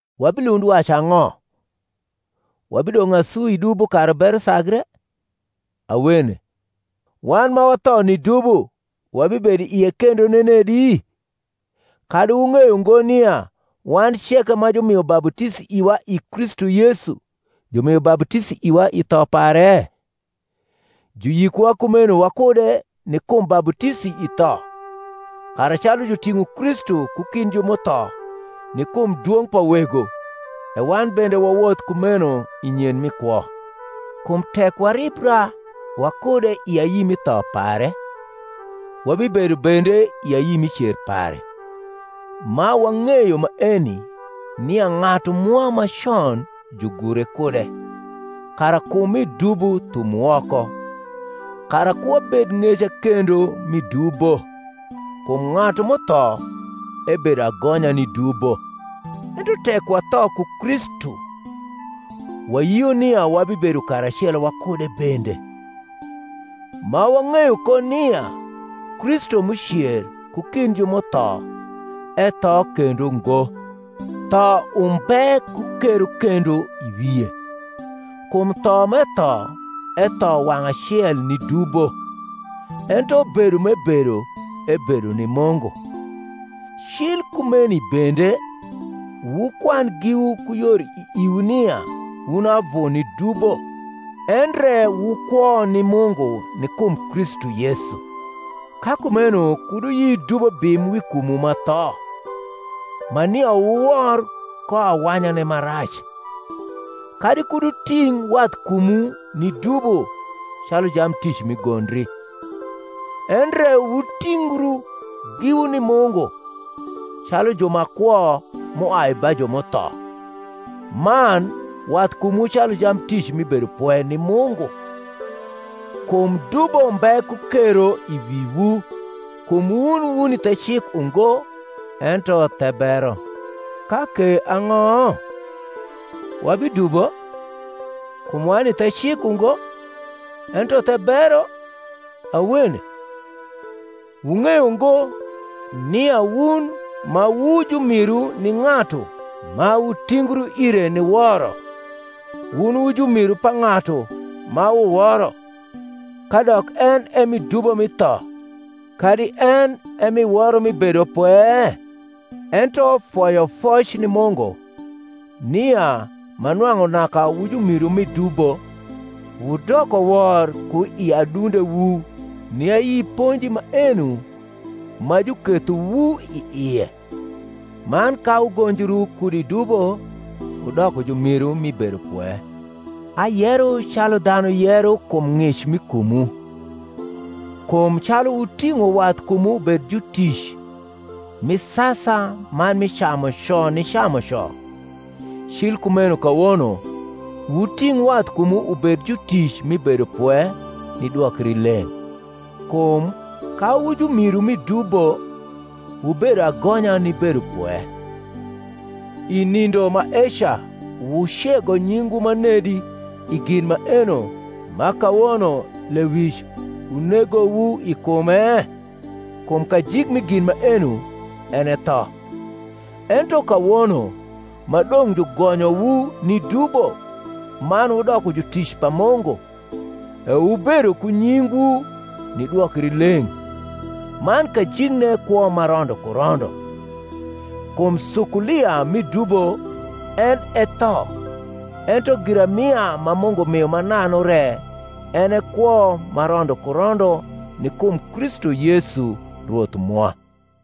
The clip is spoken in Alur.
Wabilund wacu ang’o? Wabidong’ asu i dubo, kara bero sagre? Awene. Wan ma watho ni dubo, wabibedo i ie kendo nenedi? Kadi wung’eyo ngo nia wan ceke ma jumio baputisi iwa i Kristu Yesu jumio baputisi iwa i tho pare? Juyikowa kumeno wakude ni kum baputisi i tho: kara calu juting’o Kristu ku kind ju m’utho ni kum dwong’ pa Wego, e wan bende wawoth kumeno i nyen mi kwo. Kum tek waribra wakude i ayi mi tho pare, wabibedo bende i ayi mi cer pare; ma wang’eyo maeni, nia ng’atu mwa ma con jugure kude, kara kum mi dubo thum woko, kara ku wabed ng’eca kendo mi dubo; kum ng’atu m’utho ebedo agonya ni dubo. Ento tek watho ku Kristu, wayio nia wabibedo karacelo wakude bende; ma wang’eyo ko nia Kristu m’ucer ku kind ju m’utho etho kendo ngo; tho umbe ku kero kendo i wie. Kum tho m’etho, etho wang’ acel ni dubo: ento bedo m’ebedo, ebedo ni Mungu. Cil kumeni bende wukwan giwu ku yor i iwu nia wun avu ni dubo, endre wu kwo ni Mungu ni kum Kristu Yesu. Ka kumeno kud wuyi dubo bim wi kumwu ma tho, ma nia wuwor ko awanyane ma rac: kadi kud wuting’ wathkumwu ni dubo calu jamtic mi gondri; endre wutingru giwu ni Mungu, calu ju ma kwo m’uai ba ju m’utho, man wathkumwu calu jamtic mi bedopwe ni Mungu. Kum dubo mbe ku kero i wiwu: kum wun wuni the cik ungo, ento the bero. Ka ke ang’o? wabidubo, kum wani the cik ungo, ento the bero? Awene. Wung’eyo ngo, nia wun ma wu jumiru ni ng’atu ma wutingru ire ni woro, wun wu jumiru pa ng’atu ma wuworo; kadok en e mi dubo mi tho, kadi en e mi woro mi bedopwe? Ento foyofoc ni Mungu, nia, ma nwang’u naka wu jumiru mi dubo, wudoko wor ku i adundewu ni ayi ponji maeno ma jukethowu i ie; man ka wugonjru kud i dubo, wudoko jumiru mi bedopwe. Ayero calu dhanu yero kum ng’ic mi kumwu: kum calu wuting’o wathkumwu ubed jutic mi sasa man mi camuco ni camuco, cil kumeno kawono wuting’ wathkumwu ubed jutic mi bedopwe ni dwokrileng’. Kum ka wu jumiru mi dubo, wubedo agonya ni bedopwe. I nindo maeca wucego nyingwu manedi i gin maeno ma kawono lewic unegowu i kume? kum kajik mi gin maeno en e tho. Ento kawono ma dong’ jugonyowu ni dubo man wudoko jutic pa Mungu, e wubedo ku nyingwu ni dwokrileng’, man kajikne kwo ma rondo ku rondo. Kum sukulia mi dubo en e tho; ento giramia ma Mungu mio mananu re en e kwo ma rondo ku rondo ni kum Kristu Yesu Rwoth mwa.